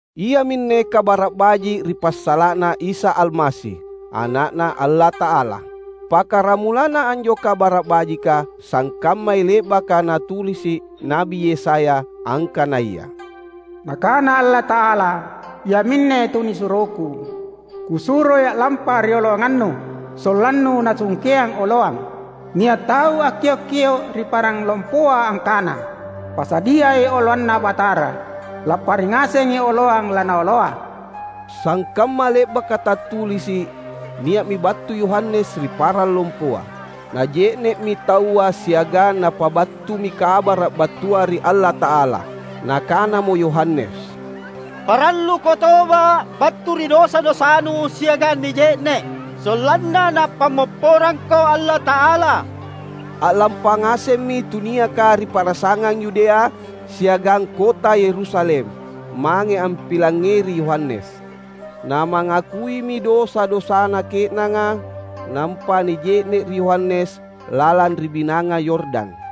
Iaminne Kabara’ Baji’ ri passala’na Isa Almasi, Ana’Na Allata’ala. Pakkaramulanna anjo Kabara’ Bajika sangkammai le’baka natulisi’ Na’bi Yesaya angkanaya, "Nakana Allata’ala, ‘Iaminne tunisuroKu; Kusuroi a’lampa rioloanganNu, sollanNu nasungkeang oloang.’ Nia’ tau akkiok-kio’ ri parang lompoa angkana, ‘Pasadiai oloanNa Batara; Lappari ngasengi oloang laNaoloa.’" Sangkamma le’baka tattulisi’, nia’mi battu Yohanes ri parang lompoa. Naje’ne’mi taua siagang napabattumi Kabara’ battua ri Allata’ala. Nakanamo Yohanes, "Paralluko toba’ battu ri dosa-dosanu siagang nije’ne’, sollanna Napammopporangko Allata’ala." A’lampa ngasemmi tuniaka ri pa’rasangang Yudea siagang kota Yerusalem, mange ampilangngeri Yohanes. Namangakuimi dosa-dosana ke’nanga, nampa nije’ne’ ri Yohanes lalang ri Binanga Yordan.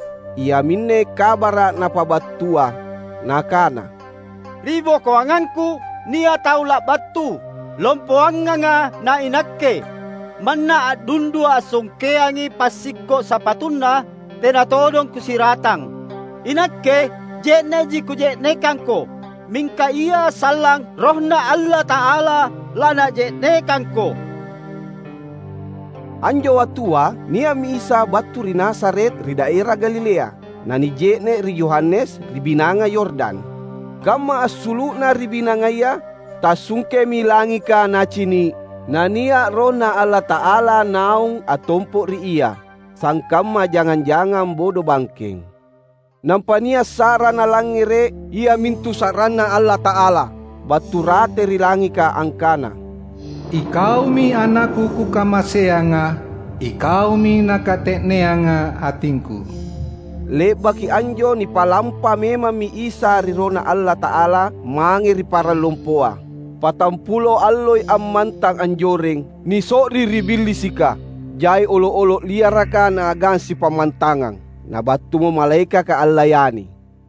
Iaminne Kabara’ napabattua, nakana, "Ri bokoangangku, nia’ tau labattu, lompoanganga na inakke. Manna a’dundua ansungkeangi passikko’ sapatuNa tena todong kusiratang. Inakke je’ne’ji kuje’nekangko, mingka Ia sallang RohNa Allata’ala laNaje’nekangko." Anjo wattua nia’mi Isa battu ri Nazaret ri daera Galilea, na nije’ne’ ri Yohanes ri Binanga Yordan. Kamma assulu’Na ri binangaya, tassungkemi langika Nacini’; na nia’ RohNa Allata’ala naung attompo’ ri Ia, sangkamma jangang-jangang bodobangkeng. Nampa nia’ sa’ra Nalangngere’ iamintu sa’ranNa Allata’ala battu rate ri langika angkana, "IKaumi AnakKu Kukamaseanga. IKaumi nakate’neanga atingKu." Le’baki anjo nipalampa memammi Isa ri RohNa Allata’ala mange ri parang lompoa. Patampulo alloi ammantang anjoreng, niso’ri ri Billisika. Jai olo’-olo’ liaraka Naagang sipammantangang; na battumo malaekaka allayani.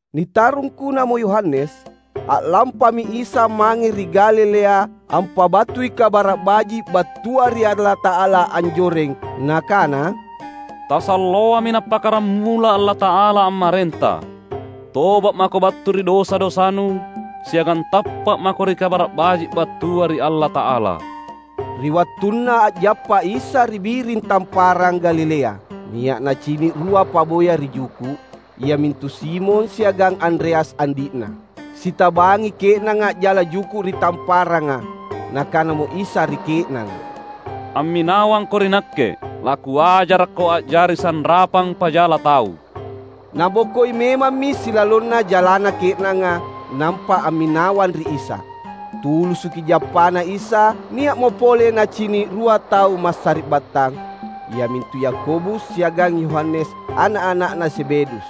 Nitarungkunamo Yohanes, a’lampami Isa mange ri Galilea ampabattui Kabara’ Baji’ battua ri Allata’ala anjoreng. Nakana, "Tasalloami nappakkaramula Allata’ala ammarenta. Toba’ mako battu ri dosa-dosanu, siagang tappa’ mako ri Kabara’ Baji’ battua ri Allata’ala!" Ri wattunna a’jappa Isa ri biring Tamparang Galilea, nia’ Nacini’ rua paboya ri juku’, iamintu Simon siagang Andreas andi’na. Sitabangi ke’nanga a’jala juku’ ri tamparanga. Nakanamo Isa ri ke’nanga, "Amminawangko ri Nakke. LaKuajarakko a’jari sanrapang pajala tau." Nabokoi memammi silalonna jalana ke’nanga, nampa amminawang ri Isa. Tulusuki jappaNa Isa, nia’mo pole nacini’ rua tau massari’battang, iamintu Yakobus siagang Yohanes ana’-ana’na Zebedeus.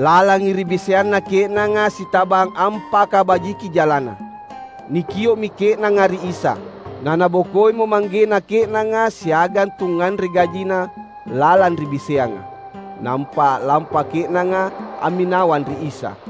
Lalangi ri biseanna ke’nanga sitabang ampakabajiki jalana. Nikio’mi ke’nanga ri Isa. Na nabokoimo manggena ke’nanga siagang tungnganre gajina lalang ri biseanga. Nampa a’lampa ke’nanga amminawang ri Isa.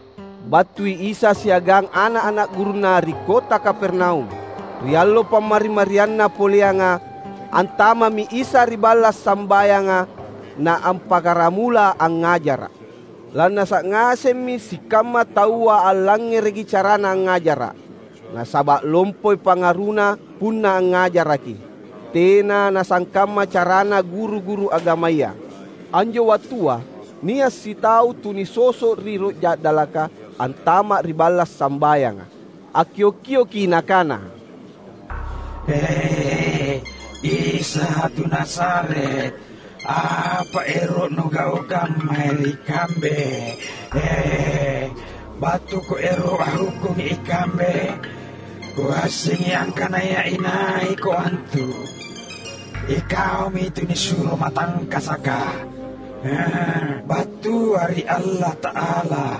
Battui Isa siagang ana’-ana’ gurunNa ri kota Kapernaum. Ri allo Pammari-marianna poleanga, antama’mi Isa ri balla’ sambayanga na appakkaramula angngajara’. Lannasa’ ngasemmi sikamma taua allangngereki caraNa angngajara’. Nasaba’ lompoi pangaruNa punna angngajaraki. Tena nasangkamma carana guru-guru agamaya. Anjo wattua nia’ sitau tu nisoso’ ri roh ja’dalaka antama’ ri balla’ sambayanga. Akkio’-kioki nakana, "E, Isa tu Nazaret, apa ero’ Nugaukang mae ri kambe? BattuKo ero’ anghukkungi ikambe? Kuassengi angkanaya inaiKo antu: iKaumi Tunisuro matangkasaka, battua ri Allata’ala!"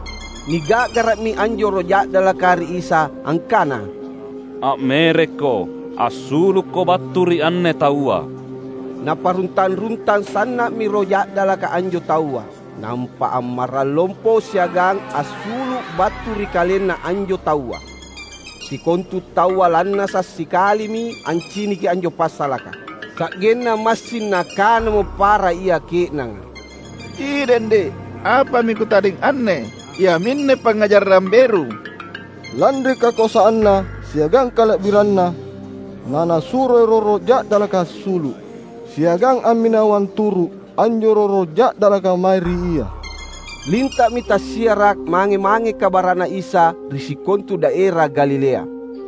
Niga’gara’mi anjo roh ja’dalaka ri Isa angkana, "A’merekko! Assulukko battu ri anne taua!" Naparuntang-runtang sanna’mi roh ja’dalaka anjo taua, nampa ammarrang lompo siagang assulu’ battu ri kalenna anjo taua. Sikontu taua lannasa’ sikalimi anciniki anjo passalaka. Sa’genna massing nakanamo para ia ke’nanga, "Idende’ apami kutadeng anne? Iaminne pangngajarang beru! Lanri kakoasanNa siagang kala’biranNa na Nasuro roh-roh ja’dalaka assulu’, siagang amminawang turu’ anjo roh-roh ja’dalaka mae ri Ia!" Linta’mi tassiara’ mange-mange kabara’na Isa ri sikontu daera Galilea.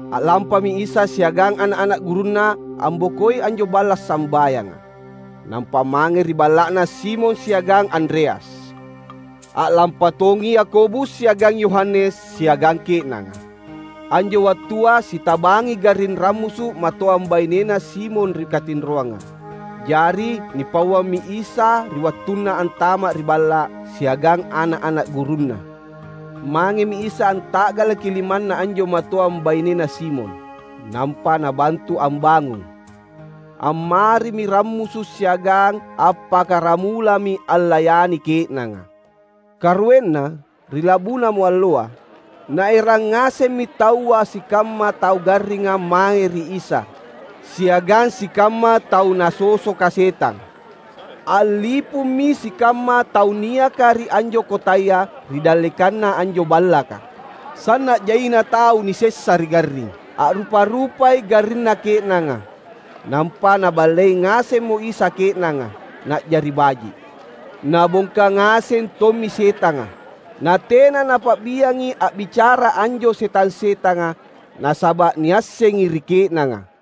A’lampami Isa siagang ana’-ana’ gurunNa ambokoi anjo balla’ sambayanga, nampa mange ri balla’na Simon siagang Andreas. A’lampa tongi Yakobus siagang Yohanes siagang ke’nanga. Anjo wattua sitabangi garring rammusu’ matoang bainena Simon ri katinroanga. Jari nipauammi Isa ri wattunna antama’ ri balla’ siagang ana’-ana’ gurunNa. Mangemi Isa anta’galaki limanna anjo matoang bainena Simon, nampa nabantu ambangung. Ammarimi rammusu’, siagang appakkaramulami allayani ke’nanga. Karuenna, ri labunamo alloa, naerang ngasemmi taua sikamma tau garringa mae ri Isa siagang sikamma tau nasosoka setang. A’lipummi sikamma tau niaka ri anjo kotaya ri dallekanna anjo ballaka. Sanna’ jaina tau nisessa ri garring. A’rupa-rupai garrinna ke’nanga. Nampa Naballei ngasemmo Isa ke’nanga, na’jari baji’. Nabongka ngaseng tommi setanga. Na tena Napa’biangi a’bicara anjo setang-setanga, nasaba’ niassengi ri ke’nanga.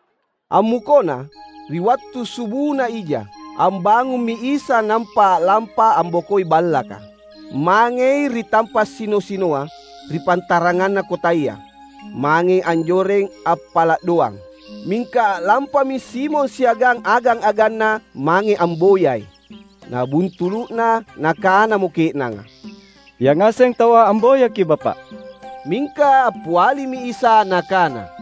Ammukona, ri wattu subuna ija, ambangummi Isa nampa a’lampa ambokoi ballaka. Mangei ri tampa’ sino-sinoa ri pantaranganna kotaya. Mangei anjoreng appala’ doang. Mingka a’lampami Simon siagang agang-aganna mange amboyai. Nabuntulu’na, nakanamo ke’nanga, "Yangaseng taua amboyaKi’ Bapa’." Mingka appialimi Isa Nakana,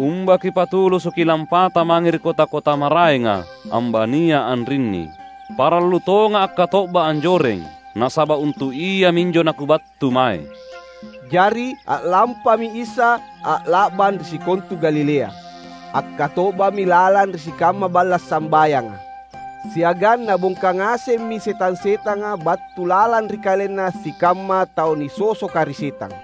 "Umba kipatulusuki lampata mange ri kota-kota maraenga, ambania anrinni. Parallu tongA’ akkato’ba anjoreng. Nasaba’ untu’ iaminjo naKubattu mae." Jari a’lampami Isa a’la’bang ri sikontu Galilea. Akkato’bami lalang ri sikamma balla’ sambayanga. Siagang Nabongka ngasemmi setang-setanga battu lalang ri kalenna sikamma tau nisosoka ri setang.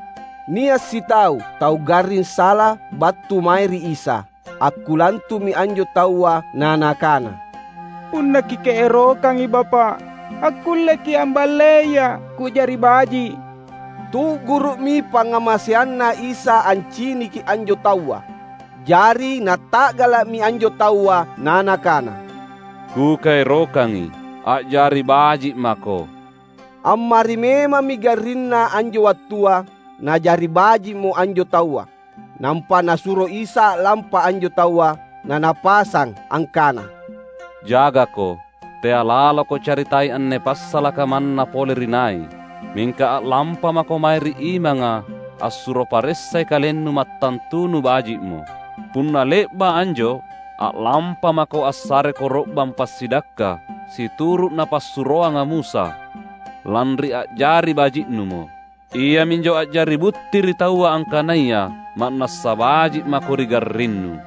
Nia’ sitau tau garring sala battu mae ri Isa. Akkulantu’mi anjo taua na nakana, "Punna Kikaerokangi Bapa’, akkulleKi’ amballeia’ ku’jari baji’." Tu’guru’mi pangngamaseanNa Isa anciniki anjo taua. Jari Nata’gala’mi anjo taua na Nakana, "Kukaerokangi, a’jari baji’ mako!" Ammari memammi garrinna anjo wattua, na’jari baji’mo anjo taua. Nampa Nasuro Isa a’lampa anjo taua. Na Napasang angkana, "Jagako, tea’ laloko caritai anne passalaka manna pole ri nai. Mingka a’lampamako mae ri imanga assuro paressai kalennu mattantunu baji’mo. Punna le’ba’ anjo, a’lampamako assare koro’bang passidakka situru’ napassuroanga Musa, lanri a’jari baji’numo. Iaminjo a’jari butti ri taua angkanaya ma’nassa baji’ mako ri garrinnu."